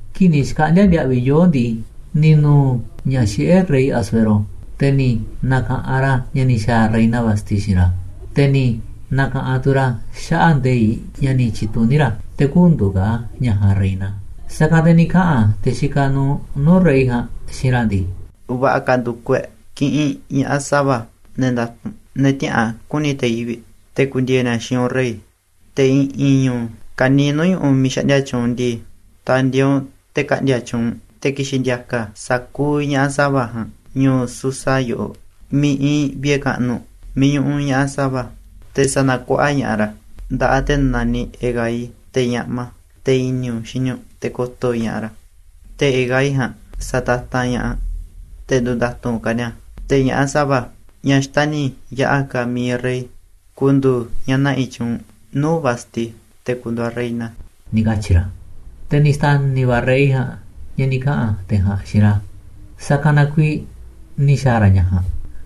Kii̱ꞌ ni̱ xkaꞌndi̱a̱ ndiaꞌviꞌ yoo̱ꞌ ndii, ni̱ nu̱u̱ ña̱ xiꞌé rey Asuero, te̱ ni̱ na̱ka̱ꞌanꞌ ra̱ ña̱ ni̱ xa̱a̱ reina Vasti xiinꞌ ra̱, te̱ ni̱ na̱ka̱ꞌanꞌ tu̱ ra̱ xaꞌa̱ꞌ nde̱iꞌ ña̱ ni̱ tyi̱tuní ra̱ te̱ kü̱ndu̱u̱ ka̱ ñaꞌ ja̱a̱nꞌ reina. Sa̱kanꞌ te̱ ni̱ kaꞌa̱n te̱ xikaꞌ nuuꞌ nuu̱ꞌ rey ja̱a̱nꞌ xiinꞌ ra̱ ndii: ―Va̱ꞌa̱ ka̱ ndu̱kuꞌ e̱ꞌ kiꞌinꞌ ña̱ꞌaꞌ sa̱va̱, ne̱ nda̱tu̱nꞌ, ne̱ tiäꞌa̱an ku̱ni̱ te̱ yivi̱ꞌ, te̱ ku̱ndi̱e̱e̱ ni̱a̱ xiinꞌ u̱nꞌ, rey. Te̱ i̱ꞌi̱n ñu̱u̱ ka̱niiꞌ nuu̱ꞌ ñu̱ꞌuꞌ miiꞌ xaꞌndia tyuunꞌ u̱nꞌ ndii, ta̱ndi̱e̱e̱ u̱nꞌ te̱ ka̱ꞌndi̱a̱ tyuunꞌ, te̱ ki̱xi̱n ndi̱a̱ka̱ sa̱kuuꞌ ña̱ꞌaꞌ sa̱va̱ ja̱a̱nꞌ ñu̱u̱ Susa yoꞌoꞌ miiꞌ iinꞌ vi̱ꞌe̱ kaꞌnuꞌ miiꞌ ñuꞌuꞌ ña̱ꞌaꞌ sa̱va̱. Te̱ sa̱na̱kuaꞌa ña̱ꞌaꞌ ra̱ nda̱ꞌaꞌ te̱ naniꞌ Hegai, te̱ ñaꞌma, te̱ i̱ni̱ u̱nꞌ xini u̱nꞌ, te̱ ko̱to̱ ña̱ꞌaꞌ ra̱. Te̱ Hegai ja̱a̱nꞌ sa̱tatanꞌ ña̱ꞌaꞌ te̱ ndu̱nda̱tu̱nꞌ ka̱ ni̱a̱. Te̱ ña̱ꞌaꞌ sa̱va̱, ñaꞌ xtani̱ yaꞌa̱ ka̱ mi̱iꞌ rey, ku̱ndu̱u̱ ñaꞌ na̱ꞌi̱ tyuunꞌ nuu̱ꞌ Vasti te̱ ku̱ndu̱u̱ aꞌ reina ―ni̱ katyi̱ ra̱. Te̱ ni̱ xta̱ni̱ va̱ rey ja̱a̱nꞌ ña̱ ni̱ kaꞌa̱n te̱ ja̱a̱nꞌ xiinꞌ ra̱, sa̱kanꞌ na kuiiꞌ ni̱ xa̱a̱ ra̱ ña̱ ja̱a̱nꞌ.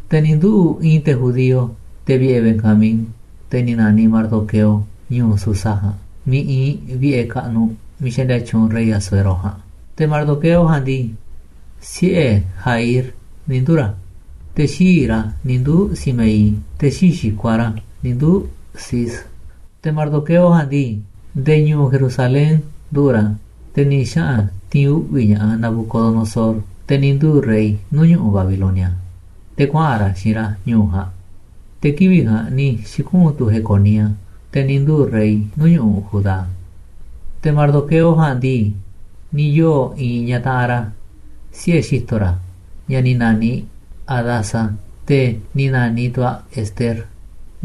Te̱ ni̱ nduꞌu̱ꞌ i̱i̱n te̱ judío, te̱ vi̱ꞌe̱ Benjamín, te̱ ni̱ na̱niꞌ Mardoqueo, ñu̱u̱ Susa ja̱a̱nꞌ miiꞌ iinꞌ vi̱ꞌe̱ kaꞌnuꞌ miiꞌ xaꞌndia tyuunꞌ rey Asuero ja̱a̱nꞌ. Te̱ Mardoqueo ja̱a̱nꞌ ndii, siꞌe̱ Jaír ni̱ nduu̱ ra̱, te̱ xii̱ꞌ ra̱ ni̱ nduu̱ Simeí, te̱ xii̱ꞌ xi̱kuaꞌ ra̱ ni̱ nduu̱ Cis. Te̱ Mardoqueo ja̱a̱nꞌ ndii, nde̱e̱ ñu̱u̱ Jerusalén nduꞌu̱ꞌ ra̱, te̱ ni̱ xaꞌa̱n ti̱i̱n uꞌvi̱ ña̱ꞌaꞌ Nabucodonosor, te̱ ni̱ nduu̱ rey nuu̱ꞌ ñu̱ꞌuꞌ Babilonia, te̱ kuaꞌa̱n ra̱ xiinꞌ ra̱ ñu̱u̱ ja̱a̱nꞌ. Te̱ kivi̱ꞌ ja̱a̱nꞌ ni̱ xi̱kuꞌu̱n tu̱ Jeconía, te̱ ni̱ nduu̱ rey nuu̱ꞌ ñu̱ꞌuꞌ Judá. Te̱ Mardoqueo ja̱a̱nꞌ ndii, ni̱ yoo̱ i̱i̱n ñaꞌ taꞌanꞌ ra̱ siꞌe̱ xi̱to̱ ra̱, ñaꞌ ni̱ na̱niꞌ Hadasa, te̱ ni̱ na̱niꞌ tu̱ aꞌ Ester.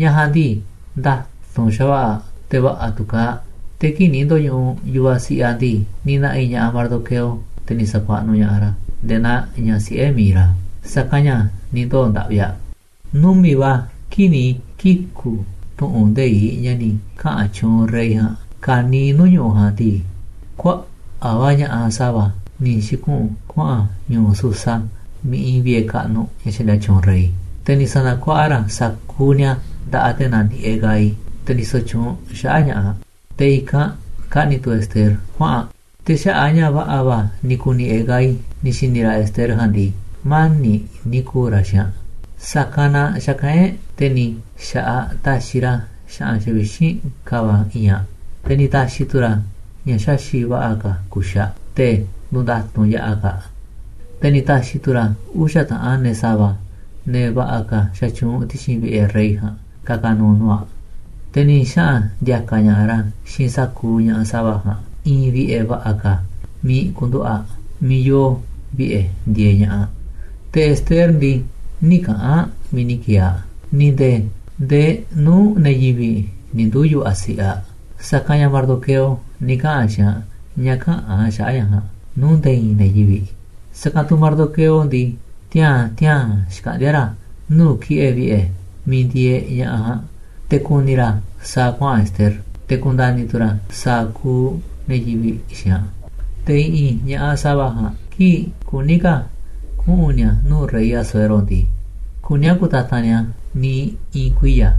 Ñaꞌ ja̱a̱nꞌ ndii, nda̱tu̱nꞌ xa̱va̱ꞌa̱ aꞌ, te̱ va̱ꞌa̱ tu̱ kaaꞌ aꞌ. Te̱ kii̱ꞌ ni̱ ndo̱ñuꞌuꞌ yu̱vaꞌ siꞌiꞌ aꞌ ndii, ni̱ na̱ꞌi̱ ña̱ꞌaꞌ Mardoqueo, te̱ ni̱ sa̱kuaꞌnuꞌ ña̱ꞌaꞌ ra̱ nde̱e̱ naa ñaꞌ siꞌe̱ mi̱iꞌ ra̱, sa̱kanꞌ ña̱ ni̱ ndoo̱ ndaꞌvi aꞌ. Numi̱ꞌ va̱ kii̱ꞌ ni̱ kiku̱ tu̱ꞌu̱n nde̱iꞌ ña̱ ni̱ kaꞌa̱n tyuunꞌ rey ja̱a̱nꞌ ka̱niiꞌ nuu̱ꞌ ñu̱ꞌuꞌ ja̱a̱nꞌ ndii, kuaꞌa̱ꞌ va̱ ña̱ꞌaꞌ sa̱va̱ ni̱ xi̱kuꞌu̱n kuaꞌa̱n ñu̱u̱ Susa miiꞌ iinꞌ vi̱ꞌe̱ kaꞌnuꞌ ña̱ xaꞌndia tyuunꞌ rey. Te̱ ni̱ sa̱na̱kuaꞌa ra̱ sa̱kuuꞌ ni̱a̱ nda̱ꞌaꞌ te̱ naniꞌ Hegai, te̱ ndisoꞌ tyuunꞌ xaꞌa̱ꞌ ña̱ꞌaꞌ, te̱ i̱kanꞌ kaꞌni̱ tu̱ Ester kuaꞌa̱n aꞌ. Te̱ xaꞌa̱ꞌ a̱ ña̱ va̱ꞌa̱ va̱ ni̱ ku̱ni̱ Hegai ni̱ xi̱ni̱ ra̱ Ester ja̱a̱nꞌ ndii, mani̱ꞌ ni̱ ku̱u̱ ra̱ xiinꞌ aꞌ, sa̱kanꞌ na xa̱kaꞌán e̱ꞌ, te̱ ni̱ xa̱ꞌaꞌ taxiꞌ ra̱ xa̱ꞌa̱n xavixínꞌ ka̱va̱ i̱i̱nꞌ aꞌ, te̱ ni̱ ta̱xi̱ tu̱ ra̱ ña̱ xaxi̱ꞌ va̱ꞌa̱ ka̱ kuxi̱ꞌ aꞌ, te̱ ndu̱nda̱tu̱nꞌ yaꞌa̱ ka̱ aꞌ. Te̱ ni̱ ta̱xi̱ tu̱ ra̱ uxa̱ taꞌanꞌ ne̱ sa̱va̱, ne̱ va̱ꞌa̱ ka̱ xatyuunꞌ ti̱xi̱n vi̱ꞌe̱ rey ja̱a̱nꞌ, ka̱ka̱ nu̱u̱ nuu̱ꞌ aꞌ, te̱ ni̱ xaꞌa̱n ndi̱a̱ka̱ ña̱ꞌaꞌ ra̱ xiinꞌ sa̱kuuꞌ ña̱ꞌaꞌ sa̱va̱ ja̱a̱nꞌ i̱i̱n vi̱ꞌe̱ va̱ꞌa̱ ka̱ miiꞌ ku̱nduꞌu̱ꞌ aꞌ, miiꞌ yoo vi̱ꞌe̱ ndieeꞌ ña̱ꞌaꞌ. Te̱ Ester ndii, nï̱ kaꞌa̱n aꞌ miiꞌ ni̱ ki̱e̱e̱ aꞌ, ni̱ nde̱e̱ ndee nuu̱ꞌ ne̱ yivi̱ꞌ ni̱ nduu̱ yu̱vaꞌ siꞌiꞌ aꞌ, sa̱kanꞌ ña̱ Mardoqueo ni̱ kaꞌa̱n xiinꞌ aꞌ ña̱ käꞌa̱n aꞌ xaꞌa̱ꞌ ña̱ ja̱a̱nꞌ nuu̱ꞌ nde̱e̱ i̱i̱n ne̱ yivi̱ꞌ. Sa̱kanꞌ tu̱ Mardoqueo ndii, tiaa̱n tiaa̱n xkaꞌndíá ra̱ nuu̱ꞌ ki̱ꞌe̱ vi̱ꞌe̱ miiꞌ ndieeꞌ ña̱ꞌaꞌ ja̱a̱nꞌ te̱ ku̱ni̱ ra̱ sa̱a̱ kuaꞌa̱n Ester, te̱ ku̱nda̱ni̱ tu̱ ra̱ sa̱a̱ kuuꞌ ne̱ yivi̱ꞌ xiinꞌ aꞌ. Te̱ i̱ꞌi̱n ña̱ꞌaꞌ sa̱va̱ ja̱a̱nꞌ, kii̱ꞌ kuní ka̱ kuꞌu̱n ni̱a̱ nuu̱ꞌ rey Asuero ndii, kuní a̱ ku̱tatanꞌ ni̱a̱ niiꞌ i̱i̱n kuiya̱.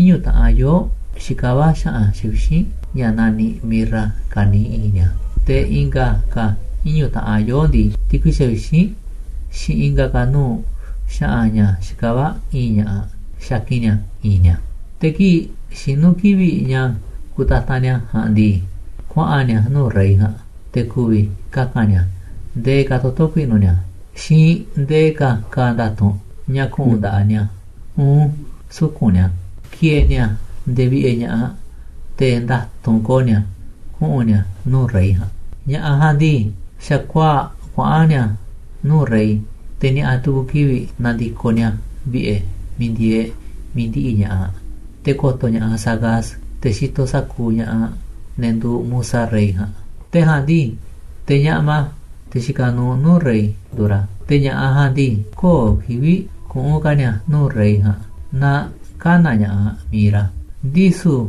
Iñu̱ taꞌanꞌ yoo̱ꞌ xikavá xa̱ꞌa̱n xavixínꞌ ña̱ naniꞌ mirra ka̱niiꞌ i̱i̱nꞌ ni̱a̱, te̱ i̱nga̱ ka̱ iñu̱ taꞌan yoo̱ꞌ ndii, ti̱kui xavixínꞌ xiinꞌ i̱nga̱ ka̱ nuu̱ꞌ xa̱ꞌa̱n ña̱ xikavá i̱i̱nꞌ ña̱ꞌaꞌ xakin ni̱a̱ i̱i̱nꞌ ni̱a̱. Te̱ kii̱ꞌ xinu̱ kivi̱ꞌ ña̱ kutatanꞌ ni̱a̱ ja̱a̱nꞌ ndii, kuaꞌa̱n ni̱a̱ nuu̱ꞌ rey ja̱a̱nꞌ, te̱ ku̱vi̱ kaka̱n ni̱a̱ ndee ka̱ toto̱ ku̱i̱ꞌnu̱ ni̱a̱, xiinꞌ ndee ka̱ ka̱a̱ nda̱tu̱nꞌ ña̱ ku̱ꞌu̱n nda̱ꞌaꞌ ni̱a̱, uun suku̱nꞌ ni̱a̱, ki̱e̱e̱ ni̱a̱ nde̱e̱ vi̱ꞌe̱ ña̱ꞌaꞌ, te̱ nda̱tu̱nꞌ ko̱o̱ ni̱a̱ kuꞌu̱n ni̱a̱ nuu̱ꞌ rey ja̱a̱nꞌ. Ña̱ꞌaꞌ ja̱a̱nꞌ ndii, xa̱kuaa̱ꞌ kuaꞌa̱n ni̱a̱ nuu̱ꞌ rey, te̱ ni̱a̱ꞌa̱ tu̱ku̱ kivi̱ꞌ na̱ndi̱koꞌ ni̱a̱ vi̱ꞌe̱ miiꞌ ndieeꞌ mi̱iꞌ ndiꞌiꞌ ña̱ꞌaꞌ te̱ ko̱to̱ ña̱ꞌaꞌ Saasgaz, te̱ xitoꞌ sa̱kuuꞌ ña̱ꞌaꞌ, ne̱ nduuꞌ musa rey ja̱a̱nꞌ. Te̱ ja̱a̱nꞌ ndii, te̱ ñaꞌma, te̱ xikaꞌ nuuꞌ nuu̱ꞌ rey, nduuꞌ ra̱. Te̱ ña̱ꞌaꞌ ja̱a̱nꞌ ndii, köo̱ꞌ kivi̱ꞌ kuꞌu̱n ka̱ ni̱a̱ nuu̱ꞌ rey ja̱a̱nꞌ naaꞌ kä̱na̱ ña̱ꞌaꞌ mi̱iꞌ ra̱, ndisu̱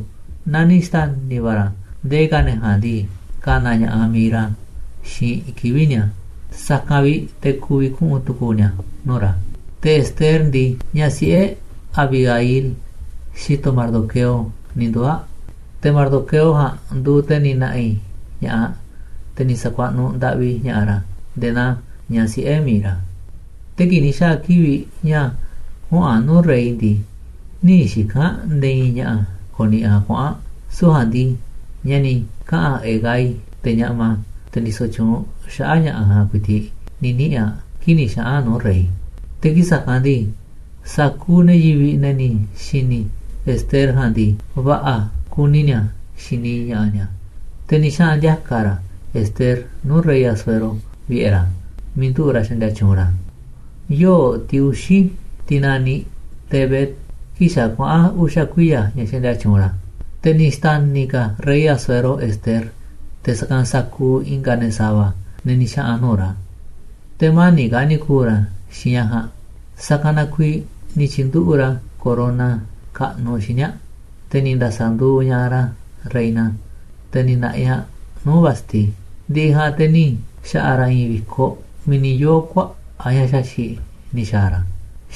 naaꞌ ni̱ xta̱ni̱ va̱ ra̱ nde̱e̱ ka̱ ne̱ ja̱a̱nꞌ ndii, ka̱na̱ ña̱ꞌaꞌ mi̱iꞌ ra̱ xiinꞌ kivi̱ꞌ ni̱a̱, sa̱kanꞌ vi̱ꞌ te̱ ku̱vi̱ kuꞌu̱n tu̱ku̱u̱ ni̱a̱ nuu̱ꞌ ra̱. Te̱ Ester ndii, ñaꞌ siꞌe̱ Abihail, xi̱to̱ Mardoqueo, ni̱ nduu̱ aꞌ, te̱ Mardoqueo ja̱a̱nꞌ nduuꞌ te̱ ni̱ na̱ꞌi̱ ña̱ꞌaꞌ, te̱ ni̱ sa̱kuaꞌnuꞌ ndaꞌvi ña̱ꞌaꞌ ra̱ nde̱e̱ naaꞌ ñaꞌ siꞌe̱ mi̱iꞌ ra̱. Te̱ kii̱ꞌ ni̱ xa̱a̱ kivi̱ꞌ ña̱ kuꞌu̱n aꞌ nuu̱ꞌ rey ndii, nï̱ xika̱n aꞌ nde̱e̱ i̱i̱n ña̱ꞌa̱ ko̱ni̱ꞌi̱ aꞌ kuꞌu̱n aꞌ. Süu̱ꞌ ja̱a̱nꞌ ndii, ña̱ ni̱ kaꞌa̱n Hegai, te̱ ñaꞌma, te̱ ndisoꞌ tyuunꞌ xaꞌa̱ꞌ ña̱ꞌaꞌ ja̱a̱nꞌ ku̱i̱ti̱ꞌ ni̱ niꞌi̱n aꞌ kii̱ꞌ ni̱ xaꞌa̱n aꞌ nuu̱ꞌ rey. Te̱ kii̱ꞌ sa̱kanꞌ ndii, sa̱kuuꞌ ne̱ yivi̱ꞌ, ne̱ ni̱ xi̱ni̱ Ester ja̱a̱nꞌ ndii, va̱ꞌa̱ kuni ni̱a̱ xini ña̱ꞌaꞌ ni̱a̱. Te̱ ni̱ xaꞌa̱n ndi̱a̱ka̱ ra̱ Ester nuu̱ꞌ rey Asuero vi̱ꞌe̱ ra̱ miiꞌ nduꞌu̱ꞌ ra̱ xaꞌndia tyuunꞌ ra̱ yoo̱ꞌ tiꞌ uxi̱, tiꞌ naniꞌ Tébet, kii̱ꞌ xa̱ kuaꞌa̱n uxa̱ kuiya̱ ña̱ xaꞌndia tyuunꞌ ra̱. Te̱ ni̱ xta̱ni̱ ka̱ rey Asuero Ester te̱ sa̱kanꞌ sa̱kuuꞌ i̱nga̱ ne̱ sa̱va̱, ne̱ ni̱ xaꞌa̱n nuu̱ꞌ ra̱, te̱ mani̱ꞌ ka̱ ni̱ ku̱u̱ ra̱ xiinꞌ ñaꞌ ja̱a̱nꞌ. Sa̱kanꞌ na kuiiꞌ ni̱ tyi̱nduꞌu̱ꞌ ra̱ corona kaꞌnuꞌ xíniꞌ aꞌ, te̱ ni̱ nda̱sa̱nduuꞌ ña̱ꞌaꞌ ra̱ reina, te̱ ni̱ na̱ꞌi̱ aꞌ nuu̱ꞌ Vasti. Ndi̱ꞌi̱ ja̱a̱nꞌ te̱ ni̱ xa̱ꞌa̱ ra̱ i̱i̱n vi̱koꞌ miiꞌ ni̱ yoo̱ kuaꞌa̱ꞌ ña̱ xaxi̱ꞌ ni̱ xa̱a̱ ra̱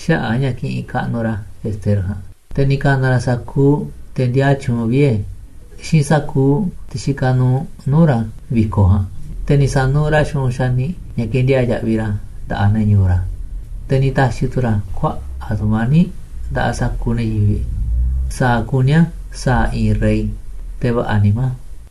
xaꞌa̱ꞌ a̱ ña̱ kiꞌinꞌ kaꞌnuꞌ ra̱ Ester ja̱a̱nꞌ, te̱ ni̱ ka̱na̱ ra̱ sa̱kuuꞌ te̱ ndiaa tyuunꞌ vie̱ xiinꞌ sa̱kuuꞌ te̱ xikaꞌ nuuꞌ nuu̱ꞌ ra̱ vi̱koꞌ ja̱a̱nꞌ, te̱ ni̱ sa̱nuuꞌ ra̱ xu̱ꞌunꞌ xaniꞌ ña̱ ke̱ndiaa̱ꞌ yaꞌviꞌ ra̱ nda̱ꞌaꞌ ne̱ ñu̱u̱ ra̱. Te̱ ni̱ ta̱xi̱ tu̱ ra̱ kuaꞌa̱ꞌ tu̱mani̱ꞌ nda̱ꞌaꞌ sa̱kuuꞌ ne̱ yivi̱ꞌ sa̱a̱ kuní a̱ sa̱a̱ i̱i̱n rey, te̱ va̱ꞌa̱ nimá.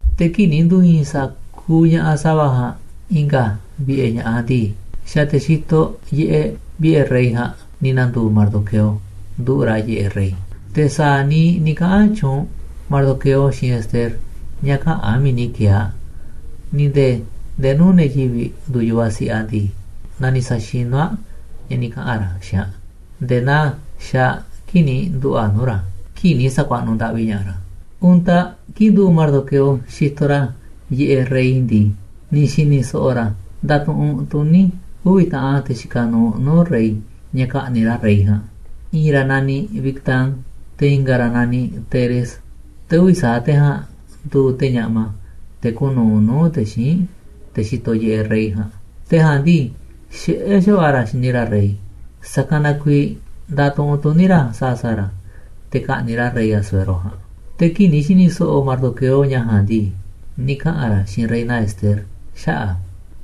Te̱ kii̱ꞌ ni̱ ndu̱i̱i̱n sa̱kuuꞌ ña̱ꞌaꞌ sa̱va̱ ja̱a̱nꞌ i̱nga̱ vi̱ꞌe̱ ña̱ꞌaꞌ ndii, xa̱ te̱ xitoꞌ yiꞌeꞌ vi̱ꞌe̱ rey ja̱a̱nꞌ ni̱ na̱ndu̱u̱ Mardoqueo nduꞌu̱ꞌ ra̱ yiꞌeꞌ rey. Te̱ sa̱a̱ niiꞌ ni̱ kaꞌa̱n tyuunꞌ Mardoqueo xiinꞌ Ester ña̱ käꞌa̱n aꞌ miiꞌ ni̱ ki̱e̱e̱ aꞌ, ni̱ nde̱e̱ ndee nuu̱ꞌ ne̱ yivi̱ꞌ nduuꞌ yu̱vaꞌ siꞌiꞌ aꞌ ndii, ni̱ sa̱xinú naa saxinú aꞌ ña̱ ni̱ kaꞌa̱n ra̱ xiinꞌ aꞌ nde̱e̱ naa xaaꞌ aꞌ kii̱ꞌ ni̱ nduꞌu̱ꞌ aꞌ nuu̱ꞌ ra̱ kii̱ꞌ ni̱ sa̱kuaꞌnuꞌ ndaꞌvi ña̱ꞌaꞌ ra̱. Untaꞌ kii̱ꞌ nduꞌu̱ꞌ Mardoqueo xitoꞌ ra̱ yiꞌeꞌ rey ndii, ni̱ xi̱ni̱ so̱ꞌo̱ ra̱ ndatuꞌunꞌ tuní uvi̱ taꞌanꞌ te̱ xikaꞌ nuuꞌ nuu̱ꞌ rey ña̱ ka̱ꞌni̱ꞌ ra̱ rey ja̱a̱nꞌ. I̱i̱n ra̱ naniꞌ Bigtán, te̱ i̱nga̱ ra̱ naniꞌ Teres. Te̱ uvi̱ sa̱aꞌ te̱ ja̱a̱nꞌ nduuꞌ te̱ ñaꞌma, te̱ kuuꞌ nu̱uꞌ nuu̱ꞌ te̱ xíinꞌ te̱ xitoꞌ yiꞌeꞌ rey ja̱a̱nꞌ. Te̱ ja̱a̱nꞌ ndii, xiꞌé xa̱va̱ꞌa̱ ra̱ xini ra̱ rey, sa̱kanꞌ na kuiiꞌ ndatuꞌunꞌ tuní ra̱ sa̱a̱ sa̱a̱ ra̱ te̱ ka̱ꞌni̱ꞌ ra̱ rey Asuero ja̱a̱nꞌ. Te̱ kii̱ꞌ ni̱ xi̱ni̱ so̱ꞌo̱ Mardoqueo ña̱ ja̱a̱nꞌ ndii, ni̱ kaꞌa̱n ra̱ xiinꞌ reina Ester xaꞌa̱ꞌ a̱,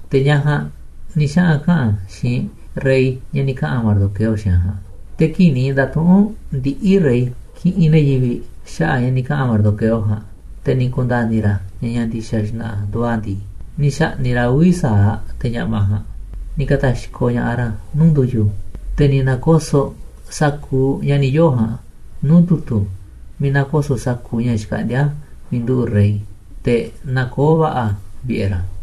te̱ ñaꞌ ja̱a̱nꞌ ni̱ xaꞌa̱n kaꞌa̱n xiinꞌ rey ña̱ ni̱ kaꞌa̱n Mardoqueo xiinꞌ aꞌ ja̱a̱nꞌ. Te̱ kii̱ꞌ ni̱ nda̱tuꞌu̱nꞌ ndiꞌi̱ rey kiꞌinꞌ ne̱ yivi̱ꞌ xaꞌa̱ꞌ ña̱ ni̱ kaꞌa̱n Mardoqueo ja̱a̱nꞌ, te̱ ni̱ ku̱nda̱ni̱ ra̱ ña̱ ña̱ ndi̱xa̱ xna̱ꞌa̱ nduuꞌ a̱ ndii, ni̱ xa̱ꞌni̱ꞌ ra̱ uvi̱ sa̱aꞌ te̱ ñaꞌma ja̱a̱nꞌ, ni̱ ka̱ta̱xkoꞌ ña̱ꞌaꞌ ra̱ nuu̱ꞌ ndu̱yu̱. Te̱ ni̱ na̱ko̱so̱ꞌ sa̱kuuꞌ ña̱ ni̱ yoo̱ ja̱a̱nꞌ nuu̱ꞌ tu̱tu̱ miiꞌ nakoso̱ꞌ sa̱kuuꞌ ña̱ xkaꞌndíá miiꞌ nduꞌu̱ꞌ rey, te̱ nakoó va̱ꞌa̱ a̱ vi̱ꞌe̱ ra̱.